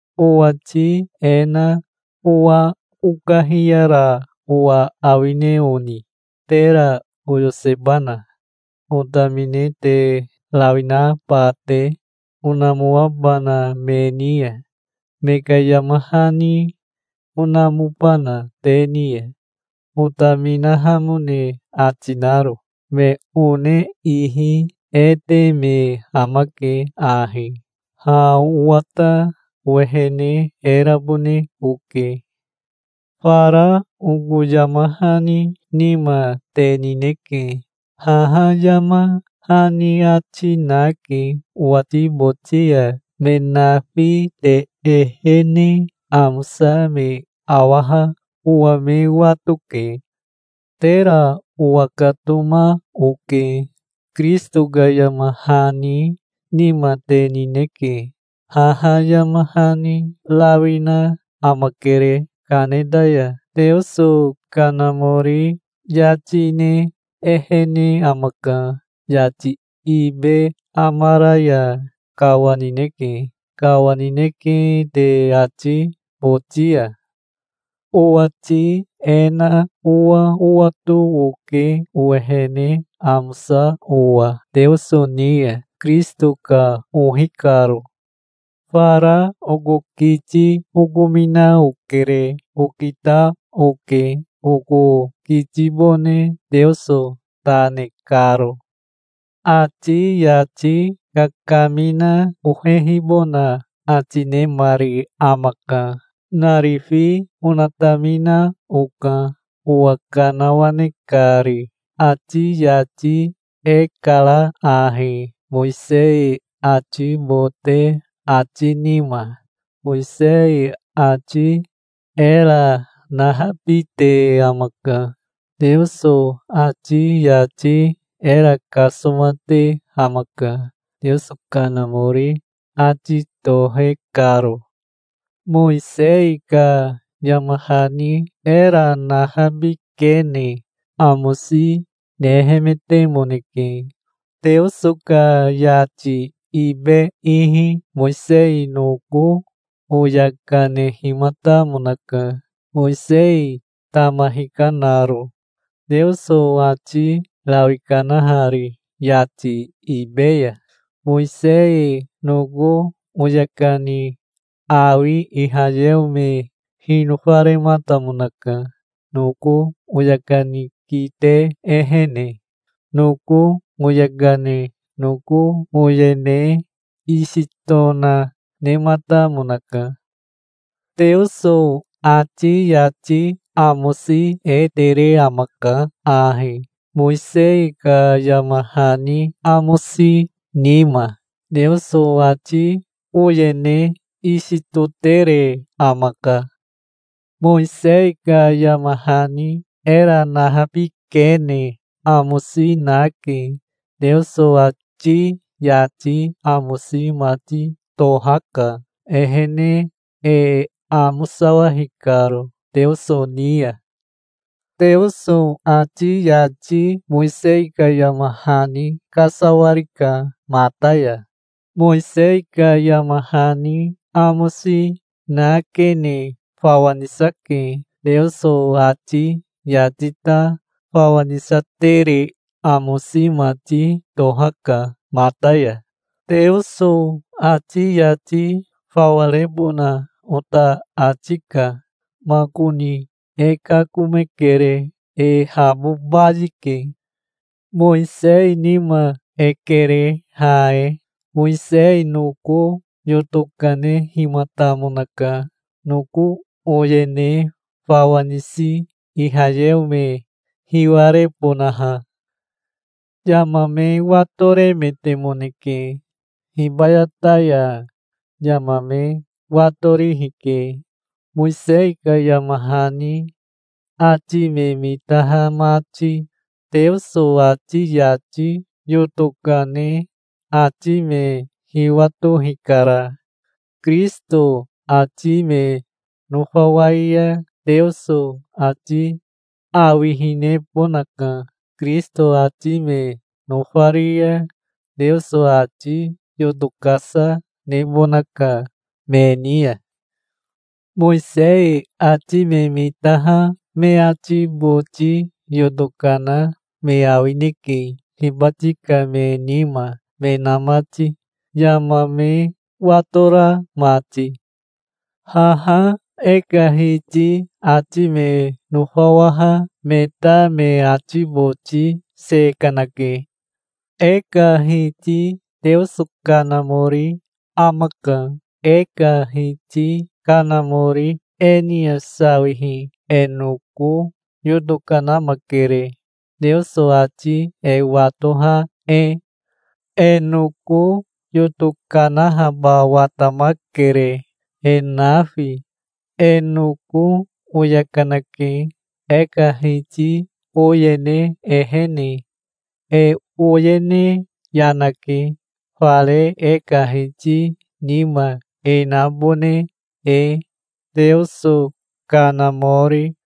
Owati e na owa okahiyara owa awine oni? Tera oyosebana, otamine te rawi naba te, onamoabana me ni ya? Me ka yama hani onamobana te ni ya, otaminahamone ati naro? Me one ihi e te me amake ahi. Ha owa ta owehene e rabone oke. Fara oko yama hani nima te nineke. Haha yama hani ati nake owati boti ya. Me nafi te ehene amosa me awaha owa me watoke. Tera owakatoma oke. Kirisito ka yama hani nima te nineke. Haha yama hani rawi na amakere kaneta ya. Teoso Kanamori yati ne ehene amaka. Yati ibe amara ya kawanineke. Kawanineke te ati boti ya. Owati e na owa owato oke, owehene amosa owa Teoso ni ya, Kirisito ka ohi karo. Fara oko kiti okomina okere. Okita oke oko kitibone Teoso ta ne karo. Ati yati kakamina ohehibona ati nemari amaka. Narifi onatamina oka, owa kanawane kari. Ati yati e kara ahi, Mowisei ati bote ati nima. Mowisei ati era nahabite amaka. Teoso ati yati era kasomate amaka, Teoso Kanamori ati tohe karo. Mowisei ka yama hani era nahabikene amosi nehemetemoneke. Teoso ka yati ibe ihi Mowisei noko oya kanehimatamonaka, Mowisei tama hikanaro, Teoso ati rawi kanahari yati ibe ya. Mowisei noko oya kani awi Ihayeo me hinofarematamonaka, noko oya kani kite ehene. Noko oya kane noko oyene isi tona nematamonaka. Teoso ati yati amosi e tere amaka ahi, Mowisei ka yama hani amosi nima. Teoso ati oyene isi totere amaka. Mowisei ka yama hani era nahabikene amosi nake. Teoso ati yati amosi mati tohaka, ehene e amosawahi karo Teoso ni ya. Teoso ati yati Mowisei ka yama hani kasawarika mata ya. Mowisei ka yama hani amosi nakene fawa nisake. Teoso ati yati ta fawa nisatere amosi mati tohaka mata ya. Teoso ati yati fawa rebona ota ati ka. Makoni e kakomekere. E habo bayike. Mowisei nima e kere ha e. Mowisei noko yoto kanehimatamonaka, noko oyene fawa nisi Ihayeo me hiwarebonaha. Yama me watoremetemoneke. Hibayata ya yama me watorihi ke, Mowisei ka yama hani ati me mitaha mati. Teoso ati yati yoto kane ati me hiwato hikara. Kirisito ati me nofawai ya Teoso ati awihinebonaka. Kirisito ati me nofari ya Teoso ati yoto kasa nebonaka me ni ya. Mowisei ati me mitaha me ati boti yoto kana me awineke, hibati ka me nima me na mati, yama me watora mati. Haha e ka Hiti ati me nofawaha me ta me ati boti se kanake. E ka Hiti Teoso Kanamori amaka. E ka Hiti Kanamori e ni ya sawihi e noko yoto kanamakere, Teoso ati e watoha e. E noko yoto kanahaba watamakere, e nafi. E noko oya kanake, e ka Hiti oyene ehene. E oyene yanake, fare e ka Hiti nima e nabone e, Teoso Kanamori.